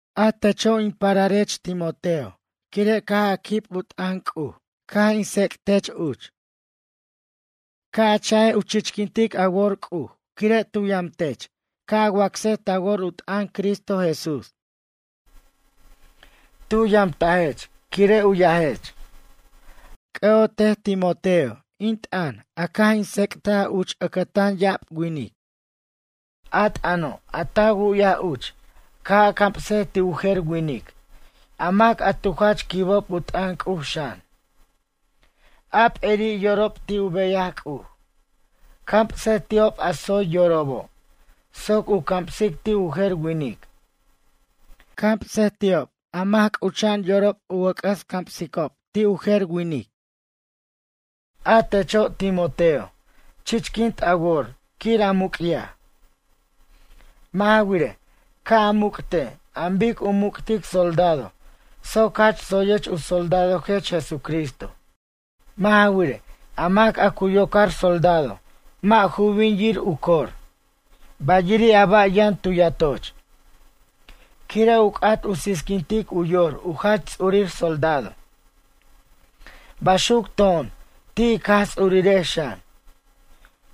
A teche' in pararech Timoteo quire' caj a quib u t'ʌn C'uj caj in tsec'tech uch. Ca' a cha'ej C'uj ca' u chichquint a wor quire' tu yamtech ca' a wacsej ta wor u t'ʌn Cristo Jesús. Tu yamtajech quire' u yajech. C'ʌ'otej Timoteo, in t'ʌn caj in tsec'taj uch ʌcʌtan ya'ab winic. A t'ʌno' a ta wu'yaj uch ca' a camsej ti' u jer winic, a mac a tu jach quib u t'ʌn C'uj xan. A p'eri' yorobo' ti' u beyaj C'uj. Camsej ti'ob a tsoy yorobo' soc u ca' camsic ti' u jer winic. Camsej ti'ob a mac c'ucha'an yorob u wʌc'ʌs camsicob ti' u jer winic. A techo' Timoteo chichquint a wor quir a muc'yaj. Mʌ' ja wirej, ca' a muc'tej an bic u muc'tic soldado soc jach tsoyech u soldadojech Jesucristo. Mʌ' ja wirej, a mac a cu yocar soldado mʌ' ju bin yir u cor. Bayiri' a ba' yʌn tu yatoch. Quire' u c'at u qui'quintic u yor u jach ts'urir soldado. Baxuc to'on ti' ij Jaj Ts'urirex xan.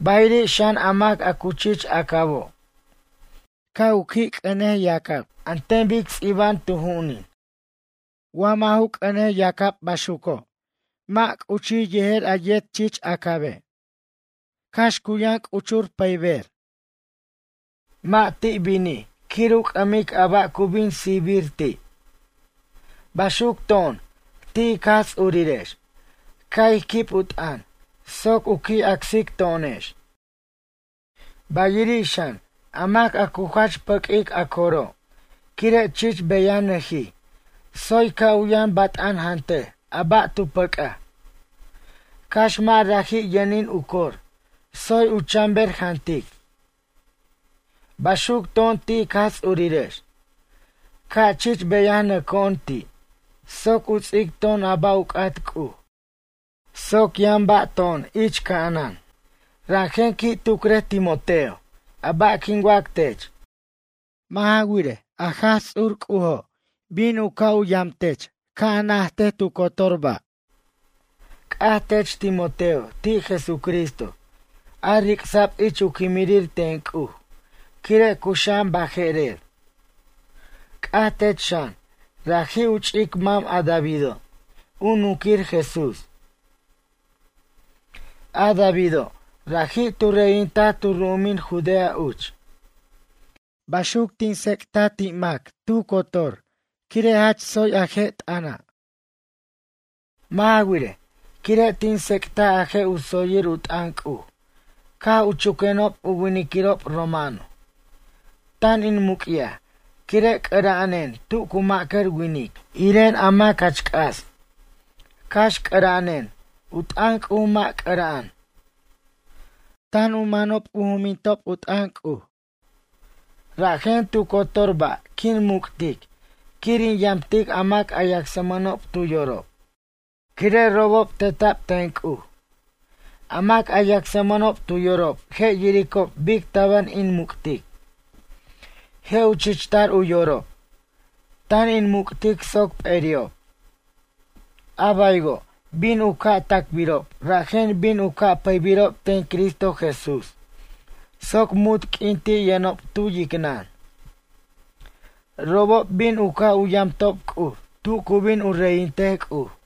Bayiri' xan a mac a cu chich acabo'. Ca' u qui' c'ʌne yacab an ten bic ts'iba'an tu ju'unin. Wa mʌ' ju c'ʌne yacab baxuco' mʌ' u chi' u jer a yet chich acabe'. Cax cu yʌn c'uchur pʌyber. Mʌ' ti' binij quir u c'ʌmic a ba' cu bin sijbir ti'. Baxuc to'on ti' ic Jaj Ts'urirex. Ca' ij quib u t'ʌn soc u qui' acsic to'onex. Ba'iri' xan, a mac a cu jach pʌq'uic a coro', quire' chich beyanʌjij tsoy ca' u yʌn bat'an jantej a ba' tu pʌc'aj. Cax mʌ' raji' yʌnin u cor. Tsoy u chan ber jantic. Baxuc to'on ti' ic Jaj Ts'urirex. Ca' chich beyanʌco'on ti' soc u ts'ic to'on a ba' u c'at C'uj soc yʌn ba' to'on ich ca'anan. Rajen qui' tucrej Timoteo a ba' quin wac tech. Mʌ' ja wirej, a Jaj Ts'ur C'ujo' bin u ca' yam tech ca' a najtej tu cotor ba'. C'aj tech Timoteo ti' Jesucristo a ric'sa'b ich u quimrir ten C'uj quire' cuxa'an baje'rer. C'aj tech xan raji' u ch'ic mam a Davido' u nunquir Jesús. A Davido' raji' tu reyintaj tu ru'umin Judea uch. Baxuc tin tsec'taj ti' mac tu cotor quire' jach tsoy a je' t'ʌna'. Mʌ' ja wirej, quire' tin tsec'taj a je' u tsoyir u t'ʌn C'uj caj u chuquenob u winiquirob romano. Tan in muc'yaj quire' c'ʌra'anen tu cu ma'cʌr winic, iren a mac jach c'as. Cax c'ʌra'anen, u t'ʌn C'uj mʌ' c'ʌra'an. Tan u manob u jumintob u t'ʌn C'uj. Rajen tu cotor ba' quin muc'tic quir in yamtic a mac a yacsmʌnob tu yorob, quire' robob teta'b ten C'uj. A mac a yacsmʌnob tu yorob je' yiricob bic tabar in muc'tic, je' u chichtar u yorob. Tan in muc'tic soc p'eri'ob. A baywo', bin u ca' tacbirob rajen bin u ca' pʌybirob ten Cristo Jesús soc munt q'uin ti' yʌnob tu yicnʌn. Robob bin u ca' u yamtob C'uj tu cu bin u reyintej C'uj.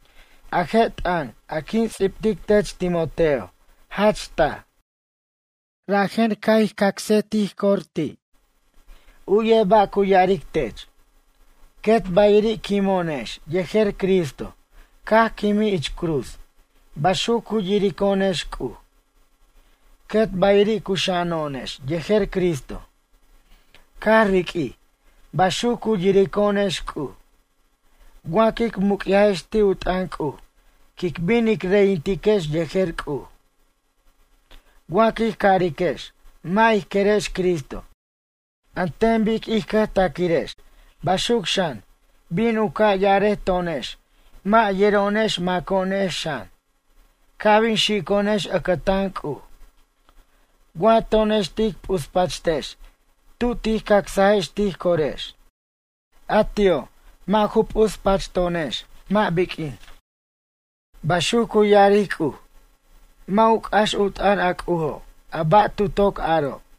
A je' t'ʌn a quin ts'ibtic tech Timoteo jach taj. Rajen ca' ij cacsej tij cor ti'. U'yej ba' cu ya'aric tech: Quet bayiri' quimo'onex yejer Cristo caj quimij ich cruz, baxuc cu yirico'onex C'uj. Quet bayiri' cuxa'ano'onex yejer Cristo, caj riq'uij, baxuc cu yirico'onex C'uj. Wa quic muc'yajex ti' u t'ʌn C'uj quic bin ic reyintiquex yejer C'uj. Wa quij cariquex mʌ' ij querex Cristo an ten bic ij cʌjtaquirex, baxuc xan bin u ca' ya'arej to'onex mʌ' yero'onex maco'onex xan ca' bin xico'onex ʌcʌtan C'uj. Wa to'onex tic p'uspachtex tu tij cacsajex tij corex, a ti'o' mʌ' ju p'uspachto'onex mʌ' biq'uin. Baxuc cu ya'aric C'uj. Mʌ' u c'ax u t'ʌn a C'ujo' a ba' tu toc aro'.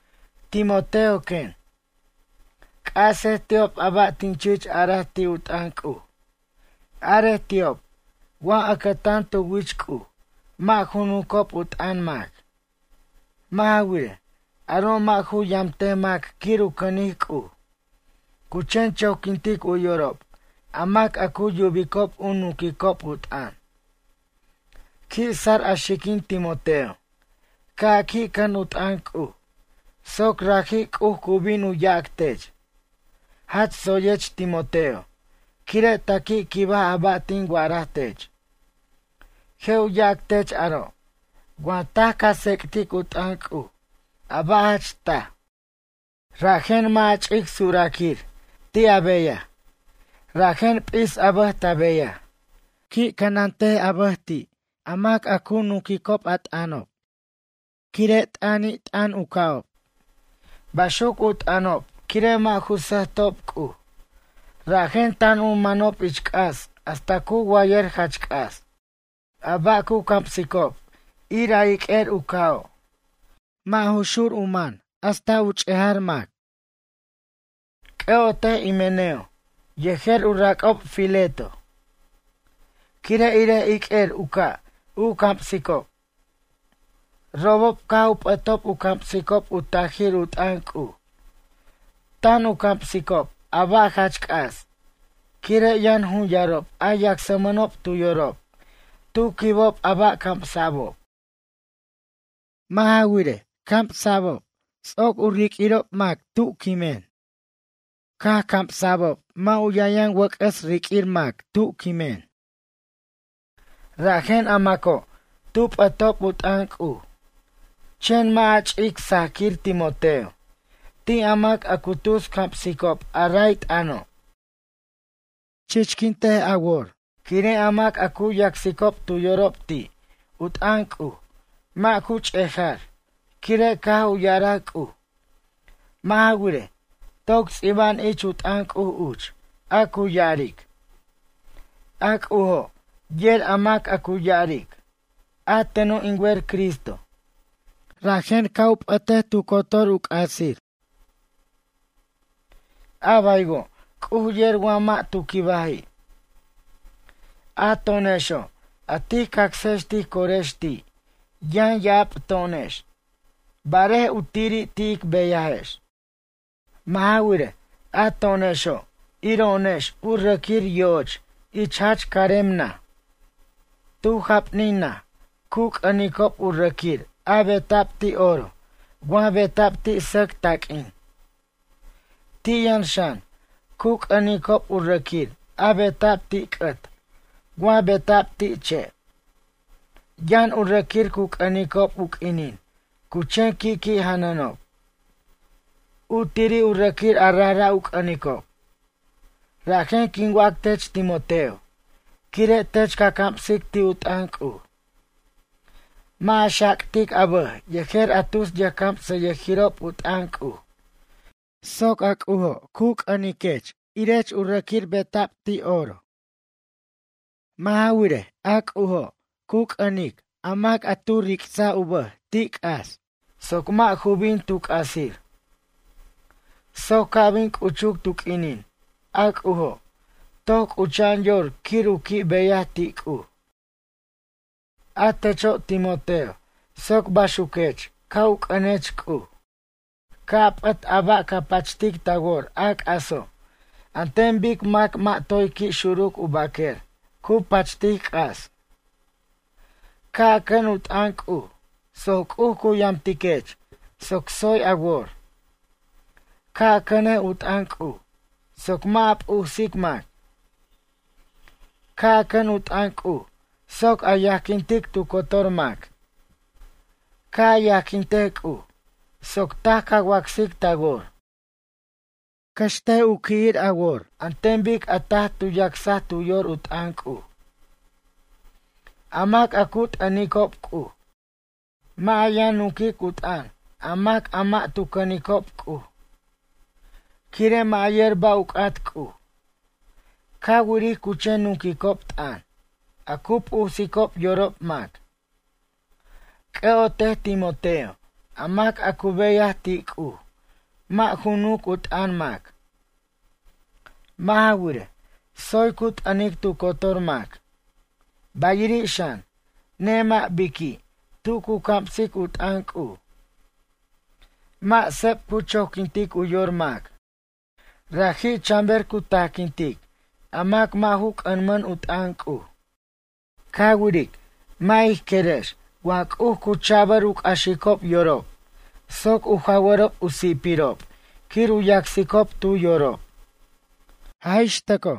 Timoteo quen. C'asej ti'ob a ba' tin chich araj ti' u t'ʌn C'uj. Arej ti'ob wa ʌcʌtan tu wich C'uj mʌ' ju nuncob u t'ʌn mac. Mʌ' ja wirej, aro' mʌ' ju yamtej mac quir u cʌnic C'uj, cu chen choquintic u yorob a mac a cu yubicob u nunquicob u t'ʌn. Qui' sar a xiquin Timoteo ca' a qui' cʌn u t'ʌn C'uj soc raji' C'uj cu bin u yac tech: ―Jach tsoyech Timoteo quire' ta qui' quibaj a ba' tin wa'araj tech. Je' u yac tech aro' wa taj ca tsec'tic u t'ʌn C'uj a ba' jach taj. Rajen mʌ' a ch'ic suraquir ti' a beyaj. Rajen p'is a bʌj ta beyaj. Qui' cʌnat a bʌj ti' a mac a cu nunquicob u t'ʌnob. Quire' t'ʌnt'ʌnan u ca'ob. Baxuc u t'ʌnob quire' mʌ' ju sʌjtob C'uj, rajen tan u manob ich c'as hasta cu wayʌr jach c'as. A ba' cu camsicob ir a iq'uer u ca'o'. Mʌ' ju xur u man hasta ch'ejar mac. C'ʌ'otej Himeneo yejer u rac'ob Fileto. Quire' irej iq'uer u ca' u camsicob. Robob caj u p'ʌtob u camsicob u tajir u t'ʌn C'uj. Tan u camsicob a ba' jach c'as, quire' yʌn jun yarob a yacsmʌnob tu yorob tu quibob a ba' camsa'bob. Mʌ' ja wirej, camsa'bob ts'oc u riq'uirob mac tu quimen. Caj u camsa'bob mʌ' u yʌn yʌn wʌc'ʌs riq'uir mac tu quimen. Rajen a maco' tu p'ʌtob u t'ʌn C'uj. Chen mʌ' a ch'ic sajquir Timoteo, ti' a mac a cu tus camsicob a ray t'ʌno'. Chichquint a wor, quire' a mac a cu yacsicob tu yorob ti' u t'ʌn C'uj mʌ' ju ch'ejar quire' caj u ya'araj C'uj. Mʌ' ja wirej, toc ts'iba'an ich u t'ʌn C'uj uch a cu ya'aric: “A C'ujo' yer a mac a cu ya'aric: A teno' in wer Cristo. Rajen ca' u p'ʌtej tu cotor u c'asi'. A baywo' C'uj yer mac tu quibaji'.” A to'onexo' a tij cacsex tij corex ti' yʌn ya'ab to'onex, barej u tiri' ti' ic beyajex. Mʌ' ja wirej, a to'onexo' iro'onex u rʌquir yo'och ich jach carem naj. Tu japnin naj cu c'ʌnicob u rʌquir a beta'b ti' oro wa beta'b ti' sʌc taq'uin. Ti' yʌn xan, cu c'ʌnicob u rʌquir a beta'b ti' c'ʌt wa beta'b ti' che'. Yʌn u rʌquir cu c'ʌnicob u q'uinin cu chen qui' qui' janʌnob. U tiri' u rʌquir a rajra' u c'ʌnicob. Rajen quin wac tech Timoteo, quire' tech ca camsic ti' u t'ʌn C'uj. Mʌ' a xactic a bʌj yejer a tus yʌjcamsʌyʌjirob u t'ʌn C'uj, soc a C'ujo' cu c'ʌniquech irech u rʌquir beta'b ti' oro. Mʌ' ja wirej, a C'ujo' cu c'ʌnic a mac a tu ric'saj u bʌj ti' c'as soc mʌ' ju bin tu c'asir. Soc ca' bin c'uchuc tu q'uinin a C'ujo'. Toc c'ucha'an yor quir u qui' beyaj ti' C'uj. A techo' Timoteo soc baxuquech ca' u c'ʌnech C'uj. Ca' a p'ʌt a ba' ca pachtic ta wor a c'aso' an ten bic mac mʌ' toy qui' xuruc u baquer cu pachtic c'as. Ca' a cʌn u t'ʌn C'uj soc C'uj cu yamtiquech soc tsoy a wor. Ca' a cʌnej u t'ʌn C'uj soc mʌ' a p'usic mac. Ca' a cʌn u t'ʌn C'uj soc a yajquintic tu cotor mac. Ca' a yajquintej C'uj, soc taj ca wacsic ta wor. Cʌxtej u qui'tar a wor an ten bic a taj tu yacsaj tu yor u t'ʌn C'uj, a mac a cu t'ʌnicob C'uj. Mʌ' a yʌn nunquic u t'ʌn a mac a mʌ' tu cʌnicob C'uj. Quire' mʌ' yer ba' u c'at C'uj. Ca wiric cu chen nunquicob t'ʌn, a cu p'usicob yorob mac. C'ʌ'otej Timoteo a mac a cu beyaj ti' C'uj mʌ' ju nunc u t'ʌn mac. Mʌ' ja wirej, tsoy cu t'ʌnic tu cotor mac. Bayiri' xan, nemʌ' biqui' tu cu camsic u t'ʌn C'uj. Mʌ' seb cu choquintic u yor mac. Raji' chanber cu tajquintic a mac a mʌ' ju c'ʌmʌn u t'ʌn C'uj. Ca wiric, mʌ' ij querex wa C'uj cu cha'bʌr u c'axicob yorob soc u jawʌrob u si'pirob quir u yacsicob tu yorob. Jaj ix tʌco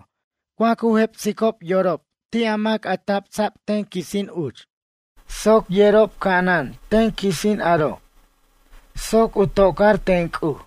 wa cu jepsicob yorob ti' a mac a tabsa'b ten quisin uch, soc yerob c'ana'an ten quisin aro'. Soc u tocar ten C'uj.